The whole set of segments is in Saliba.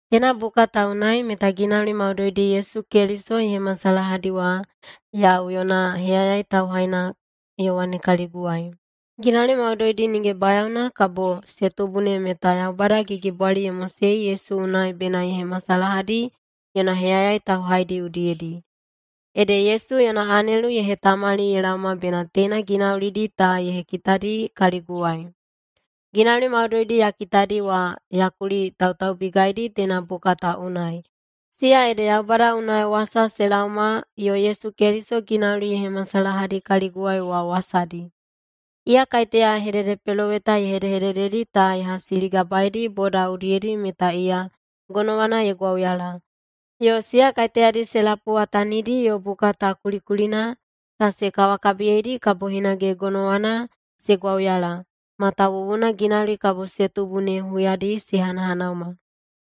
Teina buka ta unai meta ginauli maudoidi Yesu Keliso ye hemasalahadi wa yau yona heyayai tauhaina Yowane kaliguwai. Ginauli maudoidi nige bayaona kabo se tubu ne meta Yaubada gigibwali ye mosei Yesu unai bena ye hemasalahadi yona heyayai tauhaidi udiyedi. Ede Yesu yona anelu ye hetamali ye laoma bena teina ginaulidi ta ye hekitadi kaliguwai. Ginauli maudoidi ya kitadi wa ya kulitautaubigaidi teina buka ta unai, siya ede Yaubada unai wasa se laoma yo Yesu Keliso ginauli ye hemasalahadi kaliguwai wa wasadi. Iya kaiteya hededepeloweta hedehedededi ta ye hasiligabaedi boda udiyedi meta iya gonowana ye gwauyala, yo siya kaiteyadi se lapuwatanidi yo buka ta kulikulina ta se kawakabiyeidi kabo hinage gonowana se gwauyala, matawuwuna ginauli kabo se tubu ne huyadi se hanahanauma.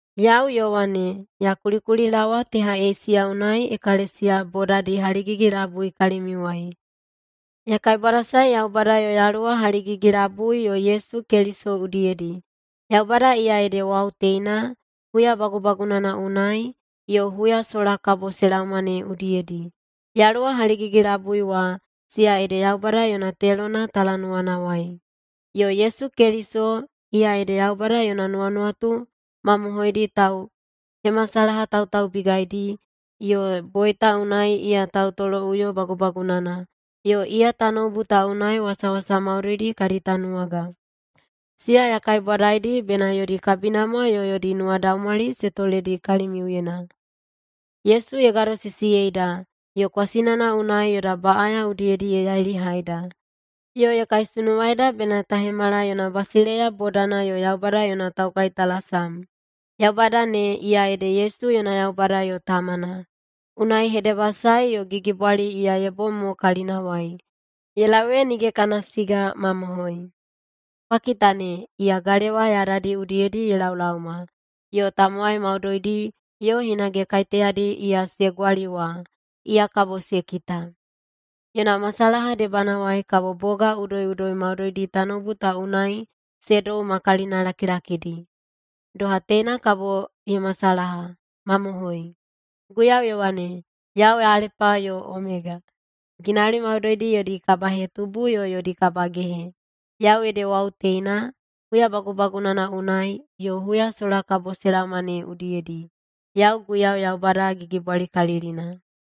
Yau Yowane, ya kulikulilaowa teha Eisiya unai ekalesiya bodadi haligigi-labui kalimiuwai. Ya kaibwadasae Yaubada yo Yaluwa haligigi-labui yo Yesu Keliso udiyedi. Yaubada iya ede wau teina, huya bagubagunana unai, yo huya sola kabo se laoma ne udiyedi. Yaluwa haligigi-labui wa, siya ede Yaubada yona telona talanuwanawai. Yo Yesu Keliso, iya ede Yaubada yona nuwanuwatu mamohoidi tauhemasalahatautaubigaidi, yo boita unai iya tautoloꞌuyo bagubagunana, yo iya tanoubu ta unai wasawasa maudoidi kadi tanuwaga. Siya ya kaibwadaidi bena yodi kabinamwa yo yodi nuwadaumwali se toledi kalimiuyena. Yesu ye gadosisiyeida, yo kwasinana unai yoda baꞌaya udiyedi ye yailihaida. Yo ye kaisunuwaida bena ta hemala yona basileiya bodana yo Yaubada yona taukaitalasam. Yaubada ne, iya ede Yesu yona Yaubada yo Tamana. Unai hedebasae yo gigibwali iya ye bom mo kalinawai, ye lau ee nige kana siga! Mamohoi! “Kwa kita ne! Iya galewa yadadi udiyedi ye laolaoma.” Yo “tamowai maudoidi, yo hinage kaiteyadi iya se gwali wa, iya kabo se kita. Yona masalaha debanawai kabo boga udoiꞌudoi maudoidi tanoubu ta unai se dou ma kalinalakilakidi.” Doha teina kabo ye masalaha! Mamohoi. Guiyau ye wane, “Yau Alepa yo Omega, ginauli maudoidi yodi kabahetubu yo yodi kabagehe. Yau ede wau teina, huya bagubagunana unai, yo huya sola kabo se laoma ne udiyedi. Yau Guiyau Yaubada Gigibwalikalilina.”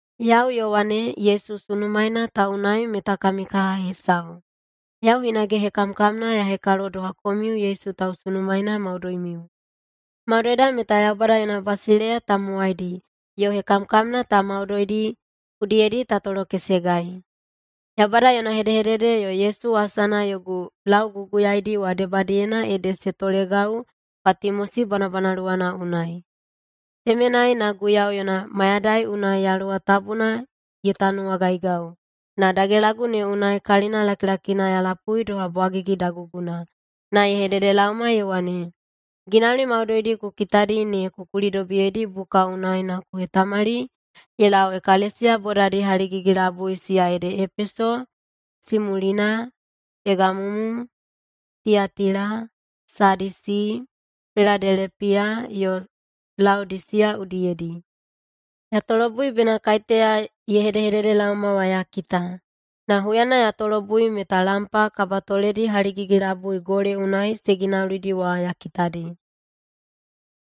Yau, Yowane, Yesu sunumaena ta unai meta kami kaha hesau. Yau hinage hekamkamna ya hekalo doha komiu Yesu tausunumaena maudoimiu. Maudoida meta Yaubada yona basileiya tamowaidi, yo hekamkamna ta maudoidi udiyedi ta tolokesegai. Yaubada yona hedehedede yo Yesu wasana yogu lauguguyaidi wa debadiyena ede se tolegau Patimosi bwanabwanaluwana unai. Temenai na Guiyau yona mayadai unai Yaluwa Tabuna ye tanuwagaigau, na dagelagu ne unai kalina lakilakina ya lapui doha bwagigi daguguna, na ye hededelaoma ye wane, “Ginauli maudoidi ku kitadi ne ku kulidobiyeidi buka unai na ku hetamali ye lau ekalesiya bodadi haligigi-labui siya ede Epeso, Simulina, Pegamumu, Tiyatila, Sadisi, Piladelepiya yo Laodisiya udiyedi.” Ya tolobui bena kaiteya ye hedehededelaoma wa ya kita. Na huyana ya tolobui meta lampa kabatoledi haligigi-labui gole unai se ginaulidi wa ya kitadi.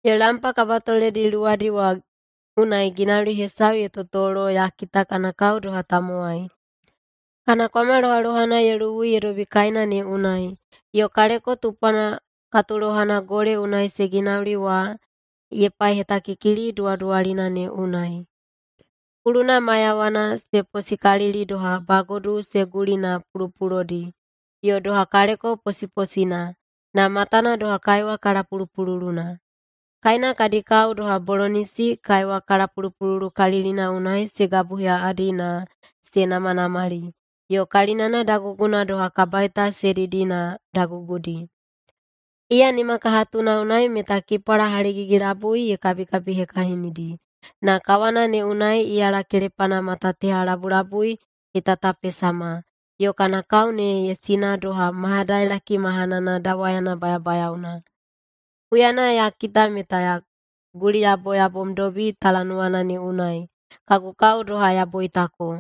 Yo lampa kabatoledi luwadi wa unai ginauli hesau ye totolo ya kita kana kao doha tamowai, kana kwama lohalohana ye luwui ye dobi kaena ne unai, yo kaleko tupwana katulohana gole unai se ginauli wa ye paihetakikili duwaduwalina ne unai. Kuluna maiyawana se posiposikalili doha bagodu se guli na pulopulodi, yo doha kaleko posiposina, na matana doha kaiwa kalapulupululuna. Kaena kadi kao doha bolonisi kaiwa kalapulupululukalilina unai se gabuheꞌaꞌadi na se namanamali, yo kalinana daguguna doha kabaita se didi na dagugudi. Iya nimakahatuna unai meta kipwala haligigi-labui ye kabikabihekahinidi, na kawana ne unai iyala kelepana mata teha labulabui ye tatapesama, yo kana kao ne ye sina doha mayadailaki mahanana dawayana bayabayaona. Huyana ya kita meta ya guliyaboyabomdobi talanuwana ne unai, kagu kao doha ya boitako.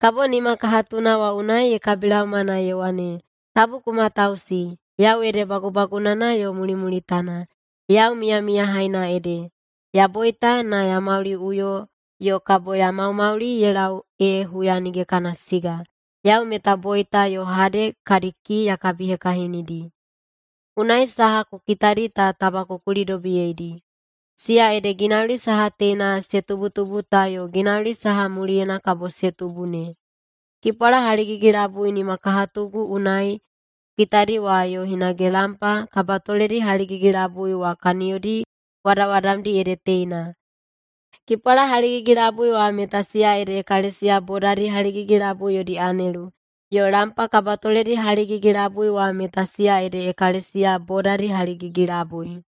Kabo nima kahatuna wa unai ye kabilaoma na ye wane, “Tabu ku matausi! Yau ede Bagubagunana yo Mulimulitana. Yau Miyamiyahaina ede. Ya boita, na ya mauliꞌuyo yo kabo ya maumauli ye lau ee huya nige kana siga! Yau meta boita yo Hade kadi kii ya kabihekahinidi. Unai saha ku kitadi ta taba ku kulidobiyeidi, siya ede ginauli saha teina se tubutubu ta yo ginauli saha muliyena kabo se tubu ne. Kipwala haligigi-labui nimakahatugu unai ku kitadi wa yo hinage lampa kabatoledi haligigi-labui wa kaniyodi wadawadamdi ede teina: Kipwala haligigi-labui wa meta siya ede ekalesiya bodadi haligigi-labui yodi anelu, yo lampa kabatoledi haligigi-labui wa meta siya ede ekalesiya bodadi haligigi-labui.”